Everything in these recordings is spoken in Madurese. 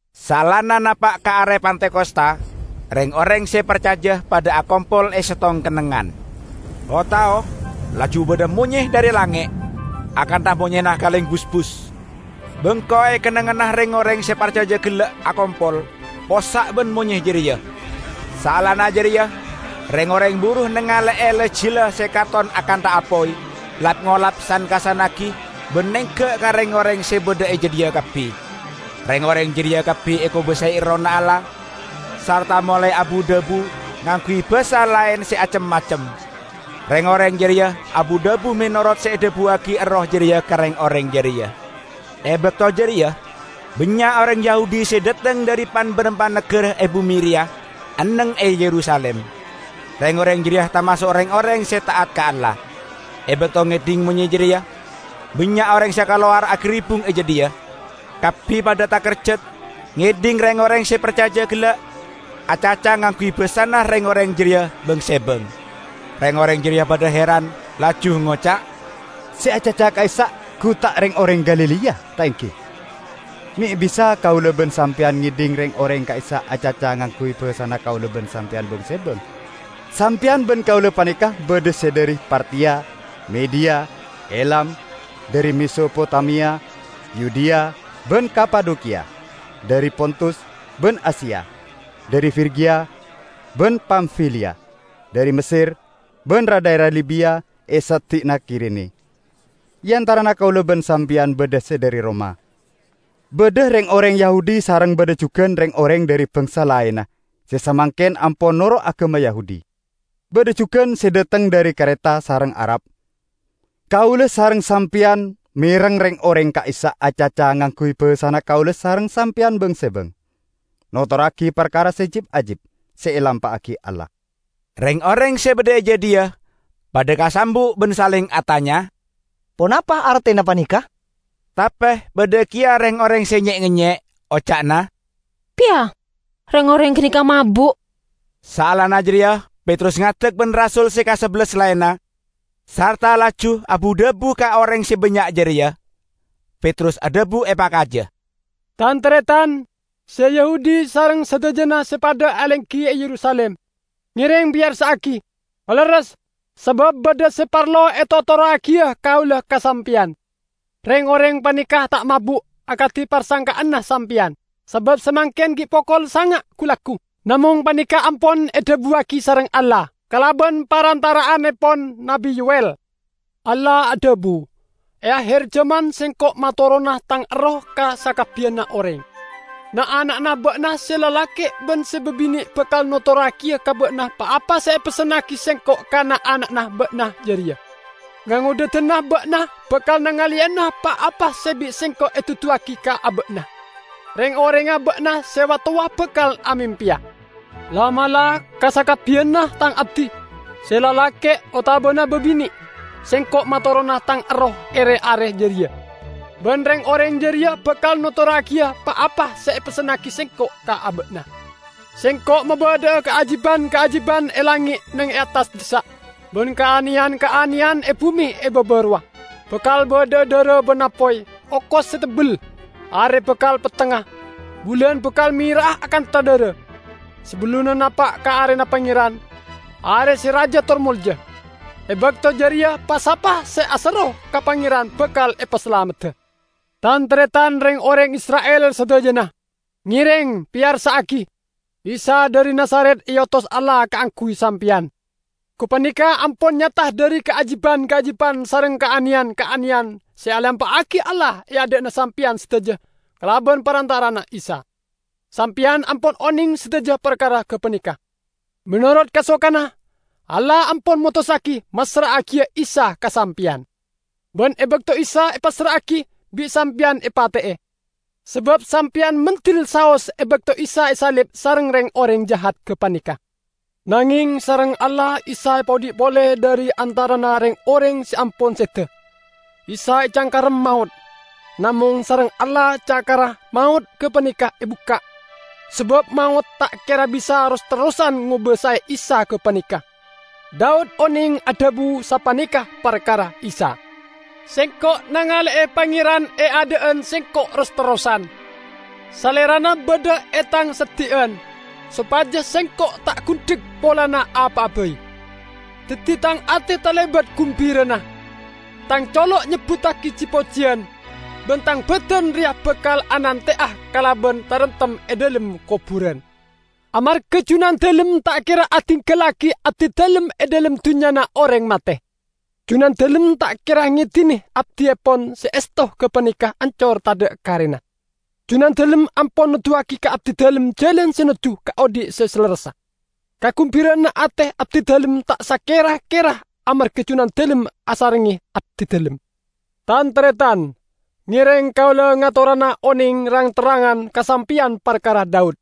Saellana napa' ka are Pentakosta, reng-oreng se parcaja padha akompol e settong kennengngan. O-tao laju badha monye dhari langnge', akantha monyena kaleng busbus. Bengko e kennengnganna reng-oreng se parcaja gella' akompol possa' ban monye jareya. Saellana jareya reng-oreng buru nangale'e la-jila se katon akantha apoy, lap-ngolap san-kassannagi ban nengga' ka reng-oreng se badha e jadhiya kabbi. Reng-oreng jareya kabbi ekobasae Errohna Allah, sarta molae abu-dhabu ngangguy basa laen se acem-macem. Reng-oreng jareya abu-dhabu menorot se edhabuwagi Erroh jareya ka reng-oreng jareya. E bakto jareya bannya' oreng Yahudi se dhateng dhari pan-barampan nagara e bume reya enneng e Yerusalim. Reng-oreng jareya tamaso' reng-oreng se ta'at ka Allah. E bakto ngedhing monye jareya, bannya' oreng se kalowar agaribbung e jadhiya. Kabbi padha takerjat ngedhing reng-oreng se parcaja gella' acaca ngangguy basana reng-oreng jareya bang-sebang. Reng-oreng jareya padha heran, laju ngoca', "Se acaca ka'issa' gu ta' reng-oreng Galilea, ta' enggi? Me' bisa kaula ban sampeyan ngedhing reng-oreng ka'issa' acaca ngangguy basana kaula ban sampeyan bang-sebang? Sampeyan ban kaula paneka badha se dhari Partiya, Mediya, Elam; dhari Mesopotamia, Yudea ban Kapadokiya; dhari Pontus ban Asia, dhari Frigia ban Pamfiliya, dhari Messer ban ra-dhaera Libiya e seddi'na Kirene; e antarana kaula ban sampeyan badha se dhari Roma, badha reng-oreng Yahudi sareng badha jugan reng-oreng dhari bangsa laenna se samangken ampon noro' agama Yahudi; badha jugan se dhateng dhari Kareta sareng Arab. Kaula sareng sampeyan mereng reng-oreng ka'issa' acaca ngangguy basana kaula sareng sampeyan bang-sebang, notorragi parkara se jib-ajib se elampa'agi Allah!" Reng-oreng se badha e jadhiya padha kasambu' ban saleng atanya, "Ponapa artena paneka?" Tape badha keya reng-oreng se nye-ngenye, oca'na, "Pya, reng-oreng ganeka mabu'!" Saellana jareya Petrus ngadek ban rasul se kasabellas laenna, sarta laju abu-dhabu ka oreng se bannya' jareya. Petrus adhabu epakaja, "Tan-taretan, se Yahudi sareng sadajana se padha alenggi e Yerusalim! Ngereng peyarsa'agi, palerres, sabab badha se parlo etotorragiya kaula ka sampeyan. Reng-oreng paneka ta' mabu' akadi parsangka'anna sampeyan; sabab samangken gi' pokol sanga' gu-laggu. Namong paneka ampon edhabuwagi sareng Allah kalaban parantara'annepon Nabbi Yow"el: Allah adhabu, 'E aher jaman Sengko' matorona Tang Erroh ka sakabbiyanna oreng. Na'-ana'na ba'na se lalake' ban se babine' bakal notorragiya ka ba'na pa-apa se epessennagi Sengko' ka na'-ana'na ba'na jareya. Ngangodhadanna ba'na bakal nangaleyana pa-apa se bi' Sengko' eduduwagi ka aba'na. Reng-orengnga ba'na se wa-towa bakal amempeya. La'-mala' ka sakabbiyanna Tang abdi -- se lalake' otabana babine' --, Sengko' matorona Tang Erroh e re-are jareya, ban reng-oreng jareya bakal notorragiya pa-apa se epessennagi Sengko' ka aba'na. Sengko' mabadha'a kaajiban-kaajiban e langnge' neng e attas dhissa', ban kaaneyan-kaaneyan e bume e baba rowa; bakal badha'a dhara ban apoy, okos se tebbel. Are bakal pettengnga, bulan bakal mera'a akantha dhara, sabellunna napa' ka Arena Pangeran, Are se raja tor molja. E bakto jareya pa-sapa se aserro ka Pangeran bakal epasalamedda.' Tan-taretan reng-oreng Isra'il sadajana! Ngereng peyarsa'agi! Isa dhari Nazaret eotos Allah kaangguy sampeyan. Gapaneka ampon nyata dhari kaajiban-kaajiban sareng kaaneyan-kaaneyan se elampa'agi Allah e adha'na sampeyan sadaja kalaban parantara'anna Isa. Sampeyan ampon oneng sadaja parkara gapaneka. Menorot kasokanna, Allah ampon motossagi massra'agiya Isa ka sampeyan. Ban e bakto Isa epassra'agi, bi' sampeyan epate'e, sabab sampeyan mendel saos e bakto Isa esalib sareng reng-oreng jahat gapaneka. Nangeng sareng Allah Isa epaodhi' pole dhari antarana reng-oreng se ampon seda. Isa ecangkarem maot, namong sareng Allah cakarra maot gapaneka ebukka', sabab maot ta' kera bisa ros-terrosan ngobasae Isa gapaneka. Daud oneng adhabu sapaneka parkara Isa, 'Sengko' nangale'e Pangeran e adha'an sengko' ros-terrosan; Salerana badha e tang seddi'an, sopaja sengko' ta' gundhek polana apa'a bai. Daddi tang ate talebat gumbirana, tang colo' nyebbuttagi ji-pojiyan; ban tang badan reya bakal anante'a kalaban taremtem e dhalem koburan. Amarga Junandalem ta' kera adinggallagi abdidalem e dhalem dunnyana oreng mate. Junandalem ta' kera ngedine abdiepon se esto gapaneka ancor tadha' karena. Junandalem ampon noduwagi ka abdidalem jalan se nojju ka odhi' se salerressa. Kagumbira'anna ate abdidalem ta' sakera-kera amarga Junandalem asarengnge abdidalem.' Tan-taretan, ngereng kaula ngatorana oneng rang-terrangan ka sampeyan parkara Daud,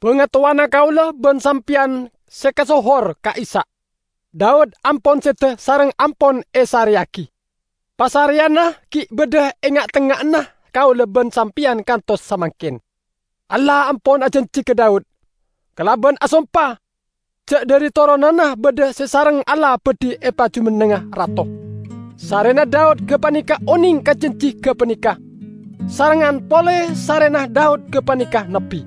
bangatowana kaula ban sampeyan se kasohor ka'issa'. Daud ampon seda sareng ampon esareyagi; pasareyanna gi' badha e enga'-tengnga'anna kaula ban sampeyan kantos samangken. Allah ampon ajanji ka Daud, kalaban asompa, ja' dhari toronanna badha se sareng Allah badhi epajumennengnga rato. Sarrena Daud gapaneka oneng ka janji gapaneka, sarengngan pole sarrena Daud gapaneka nabbi,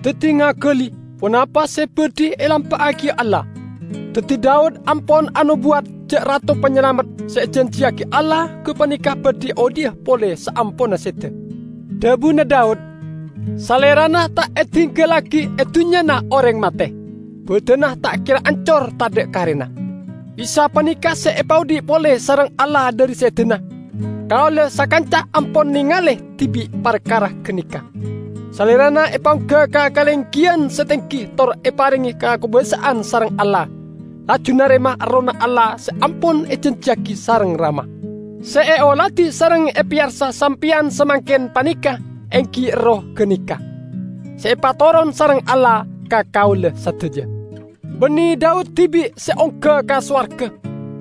daddi ngagali ponapa se badhi elampa'agiya Allah. Daddi Daud ampon anobuwat ja' Rato Panyalamet se ejanjiyagi Allah gapaneka badhi odhi'a pole saamponna seda. Dhabuna Daud, 'Salerana ta' edinggallagi e dunnyana oreng mate, badanna ta' kera ancor tadha' karena.' Isa paneka se epaodhi' pole sareng Allah dhari sedana. Kaula sakanca ampon nengale dibi' parkara ganeka. Salerana epaongga ka kalenggiyan se tenggi tor eparenge kakobasa'an sareng Allah, laju narema Errohna Allah se ampon ejanjiyagi sareng Rama. Se eoladi sareng epeyarsa sampeyan samangken paneka enggi Erroh ganeka, se epatoron sareng Allah ka kaula sadaja. Banne Daud dibi' se ongga ka sowarga,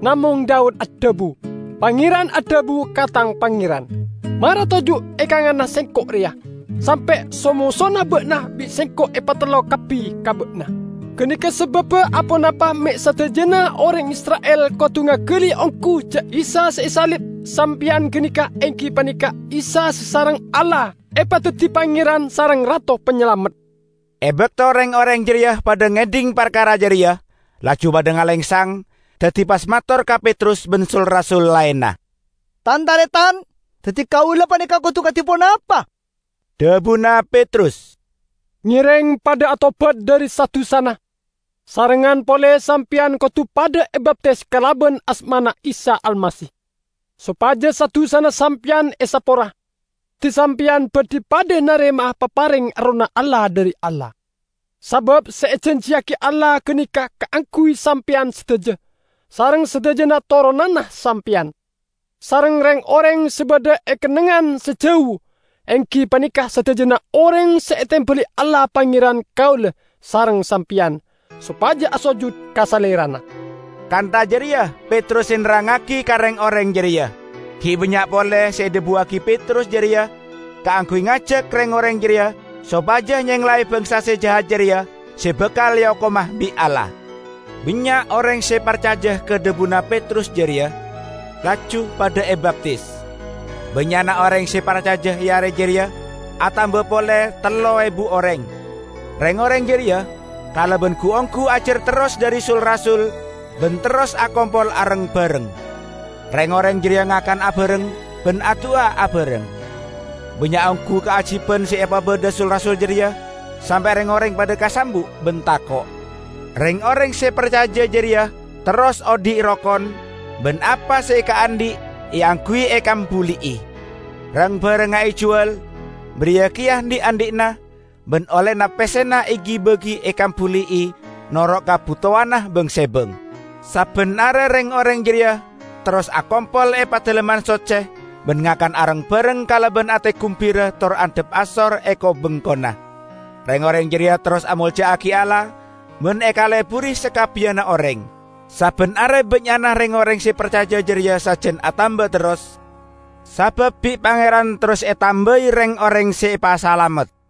namong Daud adhabu, 'Pangeran adhabu ka tang Pangeran: Mara toju' e kanganna Sengko' reya, sampe' so-mosona ba'na bi' Sengko' epatellok kabbi ka ba'na!' Ganeka sababba aponapa me' sadajana oreng Isra'il kodu ngagali onggu ja' Isa se esalib sampeyan ganeka enggi paneka Isa se sareng Allah epadaddi Pangeran sareng Rato Panyalamet!" E bakto reng-oreng jareya padha ngedhing parkara jareya, laju padha ngalengsang, daddi pas mator ka Petrus ban sul-rasul laenna, "Tan-taretan, daddi kaula paneka kodu kadi ponapa?" Dhabuna Petrus, "Ngereng padha atobat dhari sa-dusana. Sarengngan pole sampeyan kodu padha ebaptis kalaban asmana Isa Almasih, sopaja sa-dusana sampeyan esapora. Daddi sampeyan badhi padha narema'a papareng Errohna Allah dhari Allah. Sabab se ejanjiyagi Allah ganeka kaangguy sampeyan sadaja, sareng sadajana toronanna sampeyan, sareng reng-oreng se badha e kennengngan se jau -- enggi paneka sadajana oreng se etembali Allah Pangeranna kaula sareng sampeyan, sopaja asojut ka Salerana." Kantha jareya Petrus se nerrangngagi ka reng-oreng jareya. Gi' bannya' pole se edhabuwagi Petrus jareya kaangguy ngajak reng-oreng jareya sopaja nyenglae bangsa se jahat jareya se bakal eokoma bi' Allah. Bannya' oreng se parcaja ka dhabuna Petrus jareya, laju padha ebaptis. Bannya'na oreng se parcaja e are jareya atamba pole tello ebu oreng. Reng-oreng jareya kalaban gu-onggu ajar terros dhari sul-rasul ban terros akompol areng-bareng. Reng-oreng jareya ngakan abareng ban adu'a abareng. Bannya' onggu kaajiban se epabadha sul-rasul jareya sampe' reng-oreng padha kasambu' ban tako'. Reng-oreng se parcaja jareya terros odhi' rokon, ban apa se ekaandhi' eangguy ekambuli'i. Rang-barangnga ejuwal, bariya keya dhi'-andhi'na, ban ollena pessena egi-bagi ekambuli'i noro' kabutowanna bang-sebang. Sabban are reng-oreng jareya terros akompol e Padalemman Socce; ban ngakan areng-bareng kalaban ate gumbira tor andhap asor e ko-bengkona. Reng-oreng jareya terros amolja'agi Allah ban ekaleburi sakabbiyanna oreng. Sabban are bannya'na reng-oreng se parcaja jareya sajan atamba terros, sabab bi' Pangeran terros etambai reng-oreng se epasalamet.